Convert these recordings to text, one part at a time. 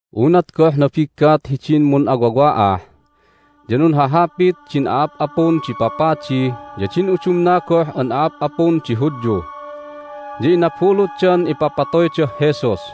Unat goh nabiggat hidin mun'awawa'ah ya nunhahapit din a'ap'apun di papadi ya din udumna goh an a'ap'apun di Hudyu, ya inabulutdan ipapatoydah Jesus.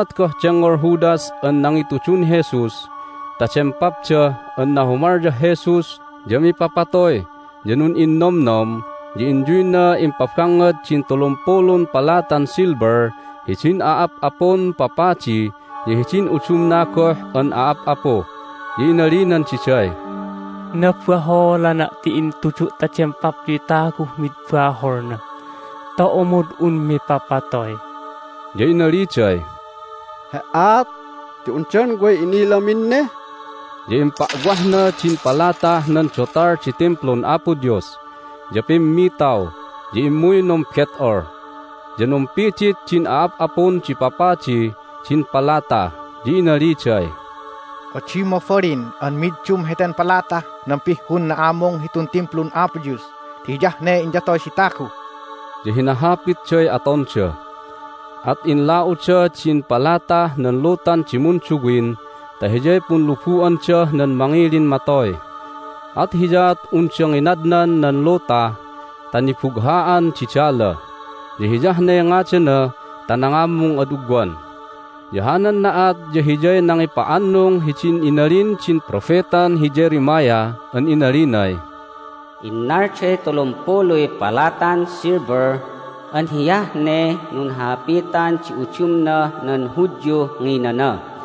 Unat goh dengngol Judas an nangitudun Jesus ta dempapda an nahumalyah Jesus ya mipapatoy ya nun'innomnom, ya inyuyna impabangngad din tulumpulun palatan silver hidin a'ap'apun papadi ya hidin udumna goh an a'ap'apu. Ya inalinan diday, "Nabaholana' ti intudu' ta dempapyuy taguh mid baholna ta omod un mipapatoy!" Ya inaliday, "He"aat ti undan way inilamin ne!" Ya impa'wahna din palatah nan dotal di Timplun Apo Dios, ya pimmitaw, ya immuy numbet'ol. Ya numpidit din a'ap'apun di papadi din palata, ya inaliday, "Adi mabalin an middum heten palatah nan pihhun na'amung hitun Timplun Apo Dios ti hiyah ne inyatoy di tagu." Ya hinahapitday atonda, at inla'uda din palatah nan lutan di munduwin ta hiyay punlubu'andah nan mangilin matoy, at hiyaat unda nginadnan nan luta ta Nibugha'an di Dala, ya hiyah ne ngadana ta nangamung ad ugwan. Ya hanan na'at ya hiyay nangipa'annung hidin inalin din propetan hi Jeremiah an inalinay, "Innalday tulumpuluy palatan silver an hiyah ne nunhahapitan di udumnah nan Hudyuh nginana.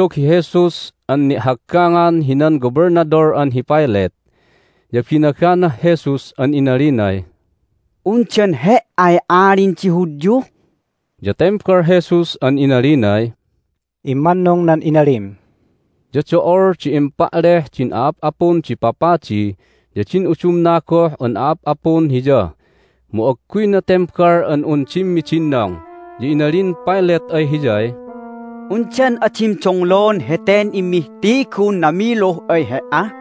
Timma'dog hi Jesus an ni'haggangan hinan Gobelnadol an hi Pilate, ya binaganah Jesus an inalinay, "Undan He"ay Alin di Hudyu?" Ya tembal Jesus an inalinay, "Immannung nan inalim." Ya do'ol di impa'leh din a'ap'apun di papadi ya din udumna goh an a'ap'apun Hiya, mu agguyna tembal an un dimmidinnong. Ya inalin Pilate ay Hiyay, "Undan adim donglon heten immihtigun namiluh ay He"a?"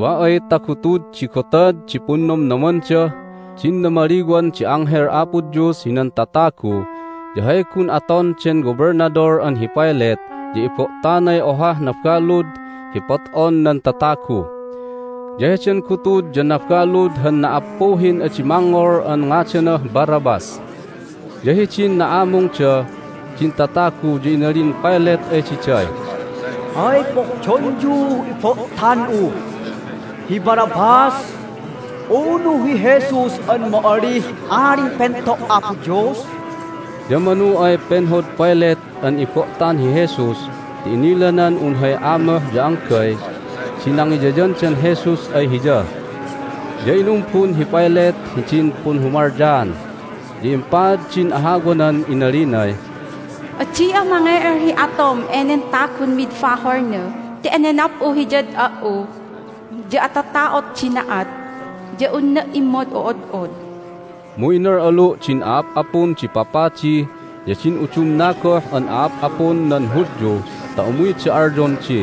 Wa ay ta gutud di gotad di Punnomnomandah din Namaliwan di Anghel Apo Dios hinan Tatagu ya hay gun aton den Gobelnadol an hi Pilate ya ibo'tanay ohah nabalud hi pot'on nan tatagu. Ya heden gutud ya nabalud han na"appuhin adi mangngol an ngadanah Barabbas. Ya hidin na'amungda din tatagu ya inalin Pilate ay diday, "Hay pohdonyuh ibo'tan'u, hi Barabbas, unu hi Jesus an ma'alih Alin Pento' Apo Dios?" Ya manu ay penhod Pilate an ibo'tan hi Jesus ti inilanan un hay amoh ya anggay di nangiyayandan Jesus ay hiya. Ya inumbun hi Pilate hidin punhumalyaan, ya impaad din ahawanan inalinay, "Adi'a mange'el hi atom enen tagun mid baholna ti enenap'u Hiyad a"u, ya atata'ot di na'at, ya unna' immod'o'od'od." Mu inal'alu' din a'ap'apun di papadi ya din udumna goh an a'ap'apun nan Hudyu ta umuyda alyon di,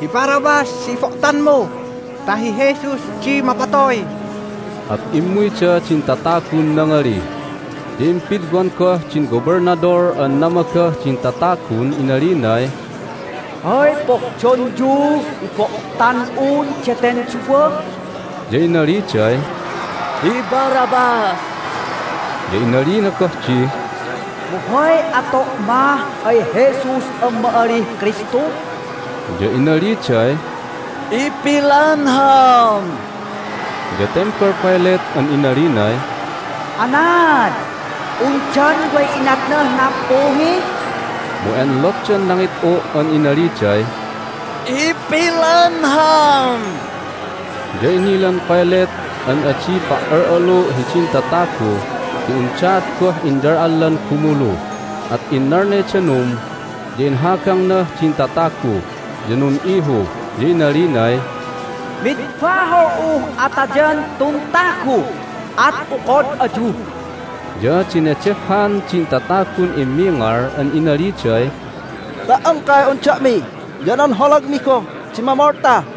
"Hi Barabbas di ibo'tanmu ta hi Jesus di mapatoy." At immuyda din tatagun nangali. Ya impidwan goh din Gobelnadol an namagah din tatagun inalinay, "Hay pohdonyuh ibo'tan'un daten duwa?" Ya inaliday, "Hi Barabbas!" Ya inalina goh di, "Mu hay ato' mah ay Jesus an ma'alih Kristu?" Ya inaliday, "Ipilanham!" Ya tembal Pilate an inalinay, "Anaad? Undan way inatnah nappuhi?" Mu enlotdan nangit'u' an inaliday, "Ipilanham!" Ya inilan Pilate an adi pa"al'alu' hidin tatagu ti undaat goh inyal'allan gumulu, at innalnay danum, ya inhagangnah din tatagu, ya nun'ihu, ya inalinay, "Mid bahol'uh atayan tun tagu. At okod ayu." Ya denedehhan din tatagun immingal an inaliday, "Ta"ongkay un da'mi ya nan holagmi goh di mamolta!"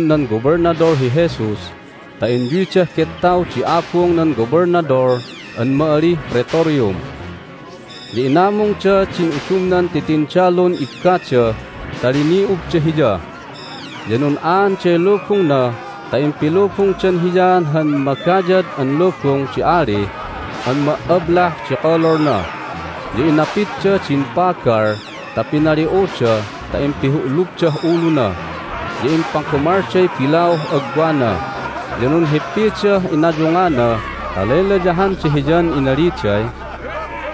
Initnud nan tindalun nan Gobelnadol hi Jesus ta inyuydah gettaw di abung nan Gobelnadol an ma'alih Praetorium, ya inamungda din udumnan titindalun ibbada ta lini'ubda Hiya. Ya nun'aanday lubungna ta impilubungdan Hiya han magayad an lubung di ali an ma"ablah di kololna, ya inapidda din pagal ta pinali'uda ta impihu'lubdah uluna, ya impagamalday bilauh agwana. Ya nunhippidah inayungana ta laylayahanda Hiyan inaliday,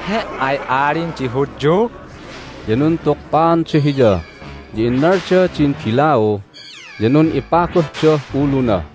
"He"ay Alin di Hudyu!" Ya nuntukpaanda Hiya, ya innalda din bilau, ya nun'ipaguhdah uluna.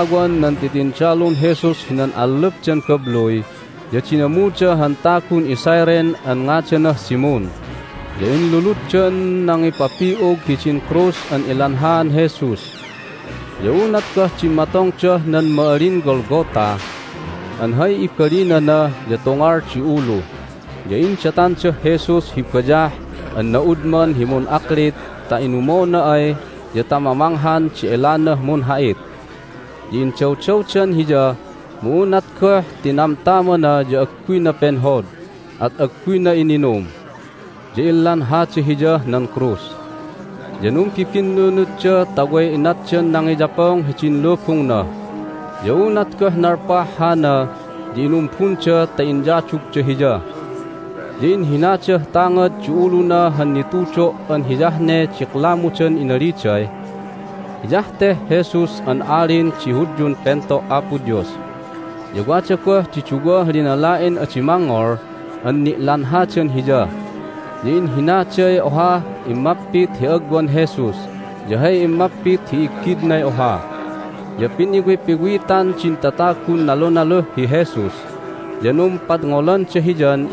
Hidin nangipitawan nan titindalun Jesus hinan allup den babluy ya dinamuda han tagun iCyrene an ngadanah Simon, ya inluluddan nangipapi'ug hidin krus an ilanhaan Jesus. Ya unat goh dimmatongdah nan ma'alin Golgotha (an hay ibalinana ya Tungal di Ulu) ya indatandah Jesus hi bayah an na'udman hi mun'aklit ta inumona ay ya ta mamanghan di elanah munha'it. Ya indawdawdan Hiya, mu unat goh tinamtamana ya agguyna penhod, at agguyna ininum. Ya inlanhada Hiyah nan krus, ya numbibinnunutda ta way inatdan nangiyapong hidin lubungna. Ya unat goh nalpah hana ya inumbunda ta iyadugda Hiya. Ya inhinadah tangad di uluna han nitudo' an hiyah ne diklamudan inaliday, "Hiyah teh Jesus an Alin di Hudyun Pento' Apo Dios." Ya wada goh di duwah linala'in adi mangngol an ni'lanhadan Hiya, ya inhinaday ohah immapit hi agwan Jesus, ya hay immapit hi iggidnay oha. Ya piniwipiwitan din tatagun nalunaluh hi Jesus, ya numpadngolanda Hiyan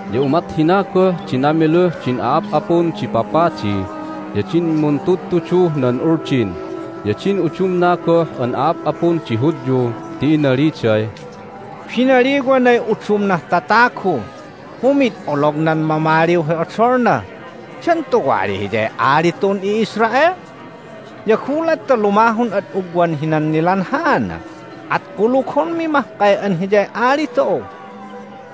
Ya umat hina goh di namiluh din a'ap'apun di papadi, ya din muntudtuduh nan Uldin, ya din udumna goh an a'ap'apun di Hudyu ti inaliday, "Binaliwanay udumnah tatagu, mu mi'id olognan mamaliw hi odolna! Dan tuwali Hiyay ali tu'un i'Israel? Ya gulat ta lumahun ad ugwan hinan nilanhaana at kulugonmi mahkay an Hiyay Ali tu'u!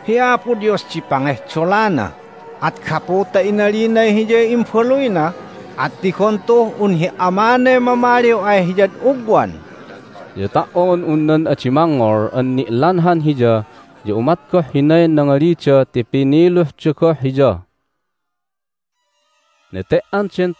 Hi Apo Dios di pangehdolana, at gapu ta inalinay Hiyay Imbaluyna at tigon tu'uh un hi Amanay mamaliw ay Hiyad ugwan!" Ya ta"on un nan adi mangngol an ni'lanhan Hiya ya umat goh hinay nangalida ti piniluhda goh Hiya. Hay Natayan Jesus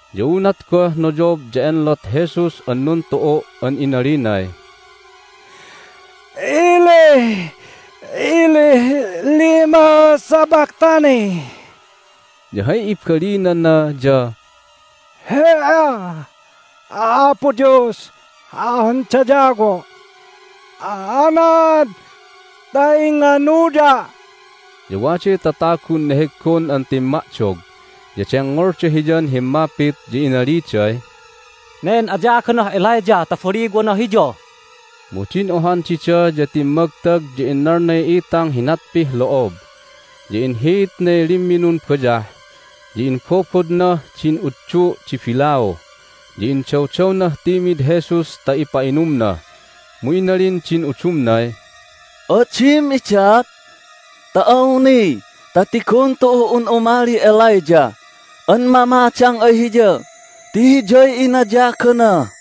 Ya unat goh noyob ya enlot Jesus an numtu'u' an inalinay, "Eli, Eli, lema sabachthani?" ya hay ibalinana ya "He"a, Apo Dios an dayawo', anaad ta inganuya'?" Ya waday tatagun neheggon an timma'dog, ya dengngolda Hiyan himmapit, ya inaliday, "Nen ayaganah Elijah ta baliwana Hiya!" Mu din ohan dida ya timmagtag ta innalnay itang hi natpih lo'ob, ya inhiitnay limminun bayah, ya imbobodnah din utdu' di bilau, ya indawdawnah timid Jesus ta ipa'inumna. Mu inalin din udumnay, "Adim idat ta awni ta tigon tu'uh un umalih Elijah an mamadang ay Hiya ti hiyay inayagana!"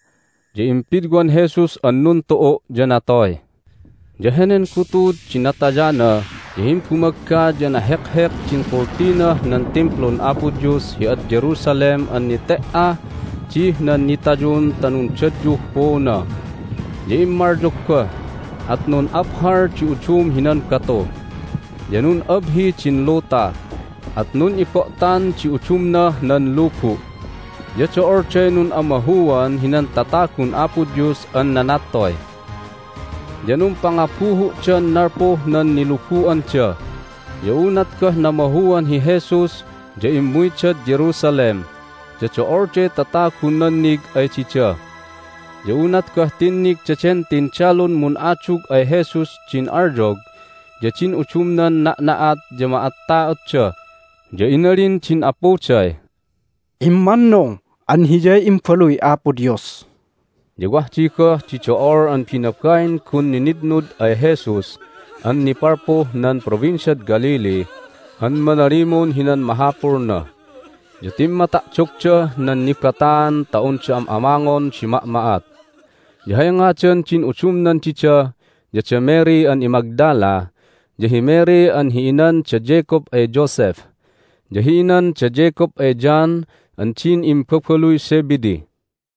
Ya impidwan Jesus an nuntu'u', ya natoy. Ya henen gutud di natayana ya himbumagga ya nahekhek din kultinah nan Timplun Apo Dios hi ad Jerusalem an nete"ah dih nan nitayun ta nundadyuh puuna. Ya immalyog goh, at nun'aphal di udum hinan batu, ya nun'abhi din luta, at nun'ibo'tan di udumnah nan lubu', ya do'olday nun'amahuan hinan tatagun Apo Dios an nanattoy, ya numpangabuhu'dan nalpuh nan nilubu'anda. Ya unat goh namahuan hi Jesus ya immuydad Jerusalem, ya do'olday tatagun nannig ay dida. Ya unat goh tinnig daden tindalun mun'adug ay Jesus din alyog ya din udumnan na'na'at ya ma'atta'otda, ya inalin din apuday, "Immannung an Hiyay Imbaluy Apo Dios!" Ya wah di goh di do'ol an binabain gun ninitnud ay Jesus an nipalpuh nan Provinciad Galilee an manalimun hinan mahapulna, ya timma'ta'dogdah nan nibataan ta unda am'amangon di ma'ma'at. Ya hay ngadan din udumnan dida ya da Mary an iMagdala, ya hi Mary an hi inan da Jacob ay Joseph, ya hi inan da Jacob ay John an din imbabaluy Zebedee. Hay Nilubu'an Jesus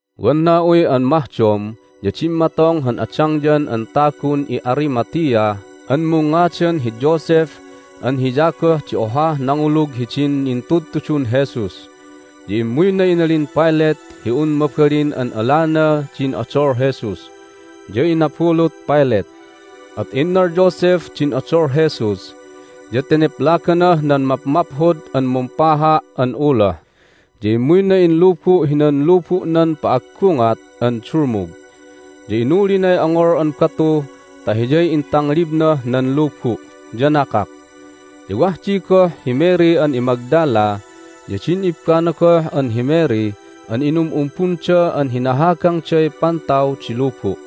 Wan na'uy an mahdom ya dimmatong han adangyan an tagun i'Arimathea an mungngadan hi Joseph an hiya goh di ohah nangulug hidin intudtudun Jesus. Ya immuyna inalin Pilate hi un mabalin an alana din odol Jesus, ya inabulut Pilate. At innal Joseph din odol Jesus, ya teneplaganah nan mapmaphod an mumpaha' an uloh, ya immuyna inlubu' hinan lubu'nan pa'aggungat an dulmug. Ya inulinay ongol an batu ta hiyay intanglibnah nan lubu', ya nakak. Ya wah di goh hi Mary an iMagdala ya din ibbana goh an hi Mary an inum'umbunda an hinahagangday pantaw di lubu'.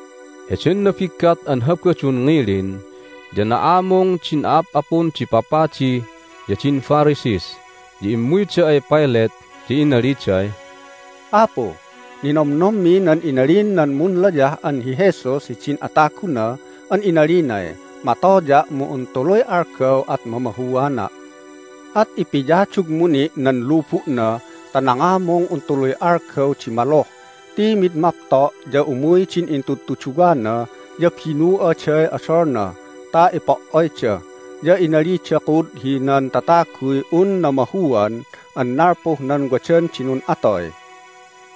Heden nabiggat an Habadun ngilin ya na'amung din a'ap'apun di papadi ya din Pharisees, ya immuyda ay Pilate, ya inaliday, "Apu, ninomnommi nan inalin nan munlayah an hi Jesus hidin ataguna an inalinay, Matoya', mu un tuluy algaw at mamahuana'. At ipiyadugmu ni' nan lubu'na ta nangamung un tuluy algaw di maluh ti mid mapto' ya umuy din intudtuduwana, ya binu'aday odolna ta ipo"oyda, ya inalida kud hinan tataguy un namahuan an nalpuh nan wadan di nun'atoy.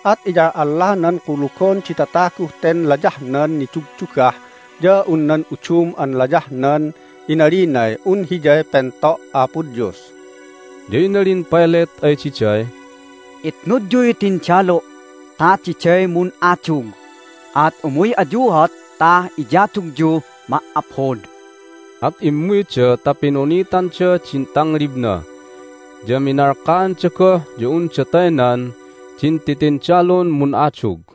At iyal'allanan kulugon di tataguh ten layahnan nidugdugah ya un nan udum an layahnan inalinay un hiyay Pento' Apo Dios!" Ya inalin Pilate ay diday, "Itnudyuy tindalu' ta diday mun'adug, at umuy ayuat ta iyadugyuh ma"aphod." At immuyda ta pinunitanda din tanglibna, ya minalkaanda goh ya unda taynan din titindalun mun'adug.